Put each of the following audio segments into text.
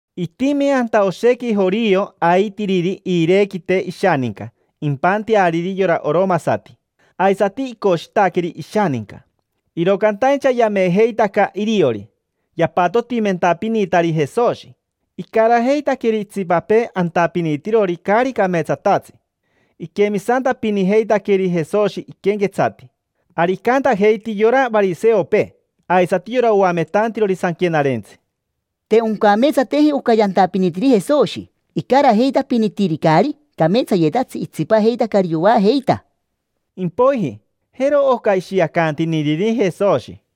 Itimi anta oshequi jorio aitiriri iirequite ishaninca impanteariri yora oromasati, aisati icoshitaqueri ishaninca. Iro cantaincha yamejeitaca iriori yapatotimentapinitari Jesoshi, icarajeitaqueri itsipapee antapinitirori caari cameetsatatsi. Iquemisantapinijeitaqueri Jesoshi iquenquetsati. Ari icantajeiti yora variseopee aisati yora oametantirori Sanquenarentsi: —Te oncameetsateji oca yantapinitiri Jesoshi: icarajeitapinitiri caari cameetsayetatsi, itsipajeitacari yoajeita. Impoiji, jero oca ishiacantiniriri Jesoshi: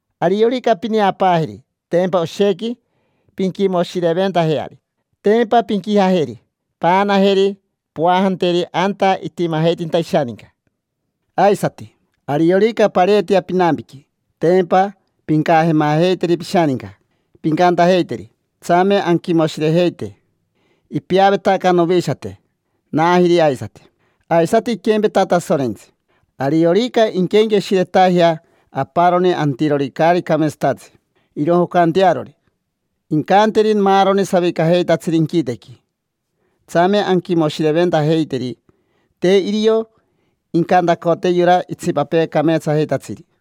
Ariorica pineapaajeri, tempa oshequi pinquimoshireventajeari. Tempa pinquijajeri, paanajeri, poajateri anta itimajeitinta ishaninca. Aisati, ariorica pareetea pinampiqui, tempa pincajemajeiteri pishaninca, pincantajeiteri: “Tsame anquimoshirejeite: ipeavetaca novishate, naajiri aisati”. Aisati iquempeta Tasorentsi. Ariorica inquenqueshiretajea aparoni antirori caari cameetsatatsi irojocantearori, incanteri maaroni savicajeitatsiri inquitequi: “Tsame anquimoshireventajeiteri”. Te irio incantacote yora itsipapee cameetsajeitatsiri.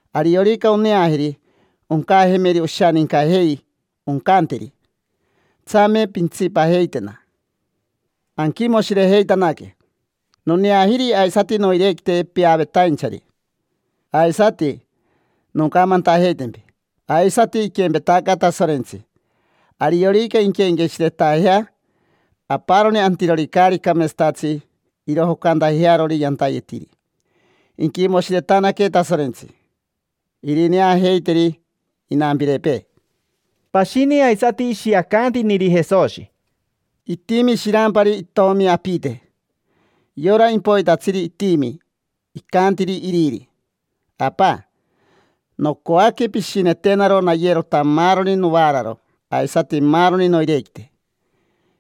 Ariorica oneajeri, oncajemeri oshanincajei, oncanteri: “Tsame pintsipajeitena, anquimoshirejeitanaque. Noneajiri aisati noirequite peavetainchari”. Aisati noncamantajeitempi: aisati iquempetaca Tasorentsi. Ariorica inquenqueshiretajea aparoni antirori caari cameetsatatsi irojocantajearori yantayetiri, inquimoshiretanaque Tasorentsi, irineajeiteri inampirepee. Pashini aisati ishiacantiniri Jesoshi: —Itimi shirampari itomi apite. Yora impoitatsiri itimi icantiri iriri: “Apa, nocoaque pishinetenaro nayerota maaroni novaararo aisati maaroni noirequite.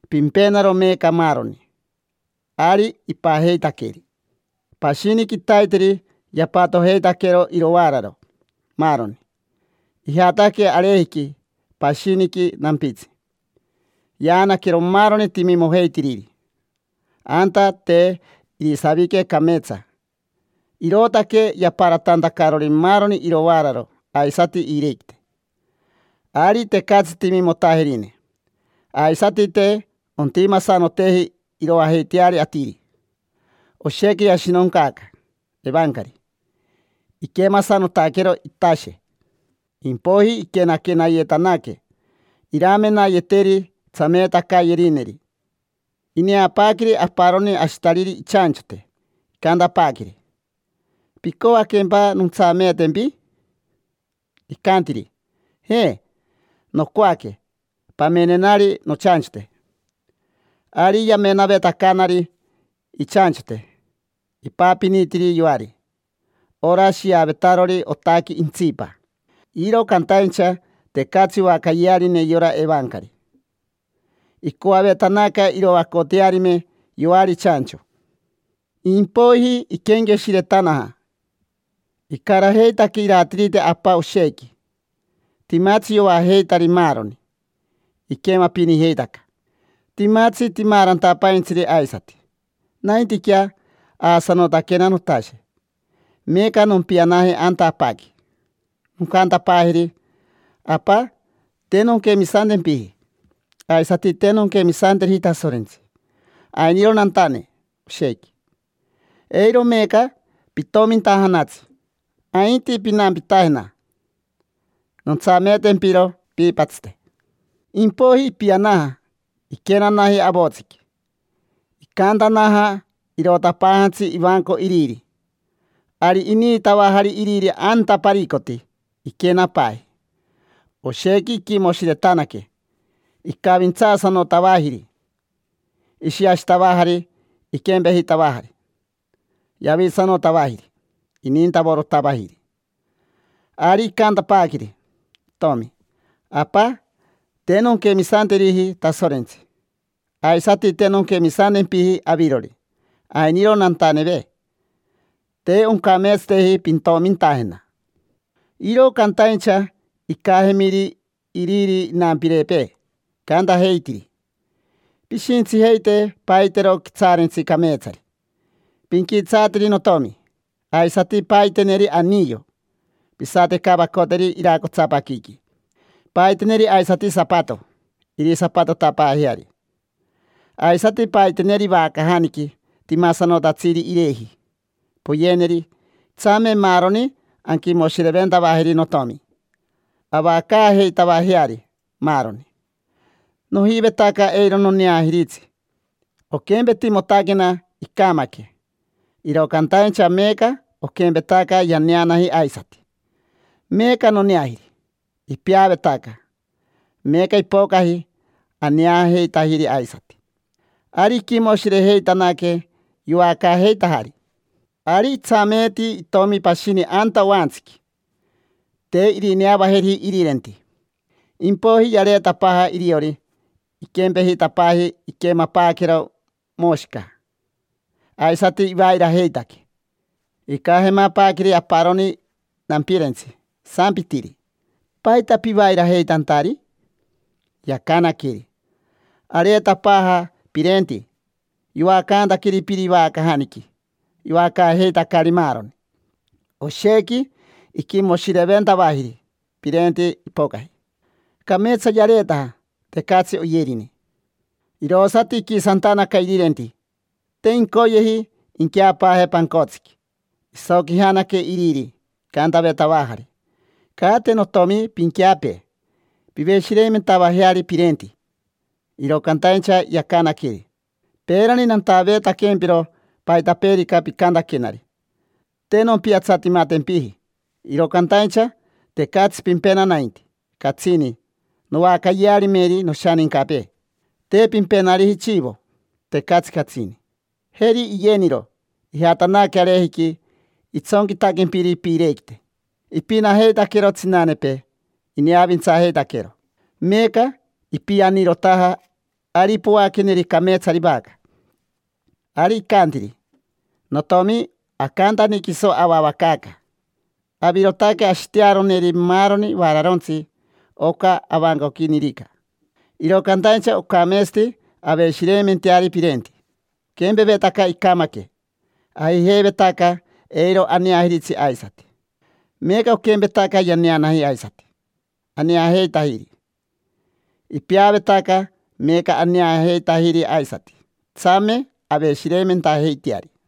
Pimpenaro meeca maaroni”. Ari ipajeitaqueri. Pashini quitaiteri yapatojeitaquero irovaararo, maaroni. Ijataque arejiqui, pashiniqui nampitsi, yaanaquero maaroni timimojeitiriri. Anta te irisavique cameetsa, irootaque yaparatantacarori maaroni irovaararo aisati iirequite. Ari tecatsi timimotajerine, aisati te ontimasanoteji iroajeiteari atiri. Oshequi yashinoncaaca evancari, iquemasanotaquero itashe. Impoiji iquenaquenayetanaque iramenayeteri tsameetacayerineri. Ineapaaqueri aparoni ashitariri ichanchote, icantapaaqueri: “¿Picoaquempa nontsameetempi?” Icantiri: “Je, nocoaque pamenenari nochanchote”. Ari yamenavetacanari ichanchote, ipapinitiri yoari: ora shiavetarori otaqui intsipa. Iro cantaincha tecatsi oacayearine yora evancari, icoavetanaca iroacotearime yoari chancho. Impoiji iquenqueshiretanaja: “Icarajeitaque iratirite apa oshequi. Timatsi yoajeitari maaroni, iquemapinijeitaca, timatsi timaarantapaintsiri aisati. Naintiquea, aasanotaquena notashe. Meeca nompianaje anta apaqui, noncantapaajeri: ‘Apa, te nonquemisantempiji, aisati te nonquemisanteriji Tasorentsi. Ainiro nantane oshequi. Eiro meeca pitomintajanatsi, ainti pinampitajena. Nontsameetempiro piipatsite’”. Impoiji ipianaja, iquenanaji avotsiqui. Icaantanaja, irotapaajantsi ivanco iriri. Ari iniitavajari iriri anta paricoti, iquenapaaji. Oshequi iquimoshiretanaque, icavintsaasanotavajiri. Ishiashitavajari iquempejitavajari, yavitsanotavajiri, inintavorotavajiri. Ari icantapaaqueri itomi: “Apa, te nonquemisanteriji Tasorentsi, aisati te nonquemisantempiji avirori. Ainiro nantaneve. Te oncameetsateji pintomintajena”. Iro cantaincha icajemiri iriri inampirepee, icantajeitiri: “Pishintsijeite, paitero quitsaarentsi cameetsari, pinquitsaateri notomi. Aisati paiteneri aniyo, pisatevacoteneri iracotsapaquiqui. Paiteneri aisati sapato, irisapatotapaajeari. Aisati paiteneri vacajaniqui, timasanotatsiri ireji, poyeneri. Tsame maaroni anquimoshireventavajeri notomi, avacaajeitavajeari, maaroni. Nojivetaca eiro noneajiritsi, oquempetimotaquena icamaque. Iro cantaincha meeca oquempetaca yaneanaji aisati, meeca noneajiri. Ipeavetaca, meeca ipocaji, aneajeitajiri aisati”. Ari iquimoshirejeitanaque, yoacaajeitajari. Ari itsameeti itomi pashini anta oantsiqui: te irineavajeriji irirenti. Impoiji yareetapaaja iriori, iquempejitapaaji iquemapaaquero moshica, aisati ivairajeitaque. Icajemapaaqueri aparoni nampirentsi, isampitiri: “¿Paita pivairajeitantari?” Yacanaqueri: “Areetapaaja pirenti. Yoacantaqueri piri vacajaniqui, yoacaajeitacari maaroni. Oshequi iquimoshireventavajiri pirenti ipocaji, cameetsa yareetaja, tecatsi oyerine”. Irosati iquisantanaca irirenti, te incoyeji inqueapaaje pancotsiqui. Isoquijanaque iriri, icantavetavajari: “Caate, notiomi, pinqueapee. Piveshireimentavajeari pirenti”. Iro cantaincha yacanaqueri: “Peerani nantaveetaquempiro paitapeerica picantaquenari, te nompiatsatimatempiji. Iro cantaincha tecatsi pimpena nainti catsini noacayearimeri noshanincapee. Te pimpenariji chivo, tecatsi catsini. Jeri iyeniro, ijatanaque arejiqui itsonquitaquempiri piirequite: ipinajeitaquero tsinanepee ineavintsajeitaquero. Meeca ipianirotaja, ari poaqueneri cameetsari vaca”. Ari icantiri: “Notiomi, acantani quiso avavacaaca. Avirotaque ashitearoneri maaroni vaararontsi oca avancoquinirica. Iro cantaincha ocameetsati aveshireimenteari pirenti. Oquempevetaca icamaque, ajijeivetaca eiro aneajiritsi aisati. Meeca oquempetaca yaneanaji aisati, aneajeitajiri. Ipeavetaca, meeca aneajeitajiri aisati. Tsame aveshireimentajeiteari”.